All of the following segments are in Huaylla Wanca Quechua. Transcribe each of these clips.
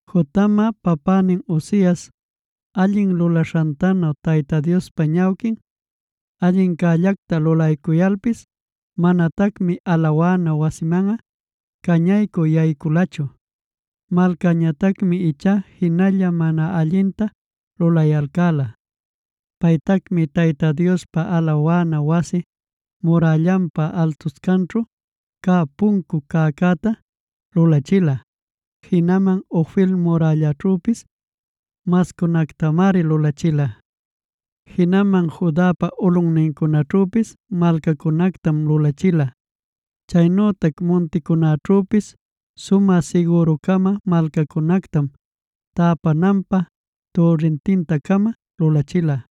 Jotamꞌa papänin Uzias allin lulaśhantanu Tayta Diospa ñawquin allincällacta lulaycuyalpis manatacmi alawana wasinmanꞌa cañaycü yayculachu. Malcäñatacmi ichá jinalla mana allinta lulayalcäla. Paytacmi Tayta Diospa alawana wasi murällanpa altuscanćhu cä puncun cäcäta lulachila. Jinaman Ofel murällaćhüpis mascunactamari lulachila. Jinaman Judapa ulꞌuncunaćhüpis malcacunactam lulachila. Chaynütac munticunäćhüpis sumä siguru-cama malcacunactam, täpananpä türrintinta-cama lulachila.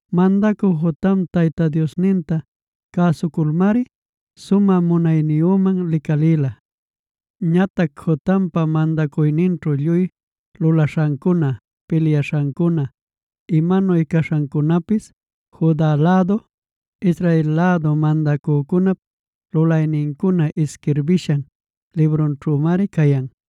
Mandacü Jotam Tayta Diosninta cäsuculmari sumä munayniyüman licalïla. Ñatac Jotampa mandacuyninćhu lluy lulaśhancuna, pilyaśhancuna, imanuy cawsaśhancunapis Juda lädu, Israel lädu mandacücunap lulaynincuna isquirbishan librunćhümari cayan.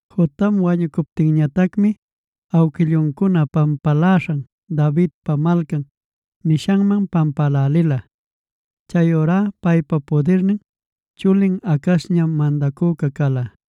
Jotam wañucuptinñatacmi awquilluncuna pampaläśhan Davidpa Malcan nishanman pampälälila. Chayurá paypa pudirnin chulin Acazñam mandacüca cala.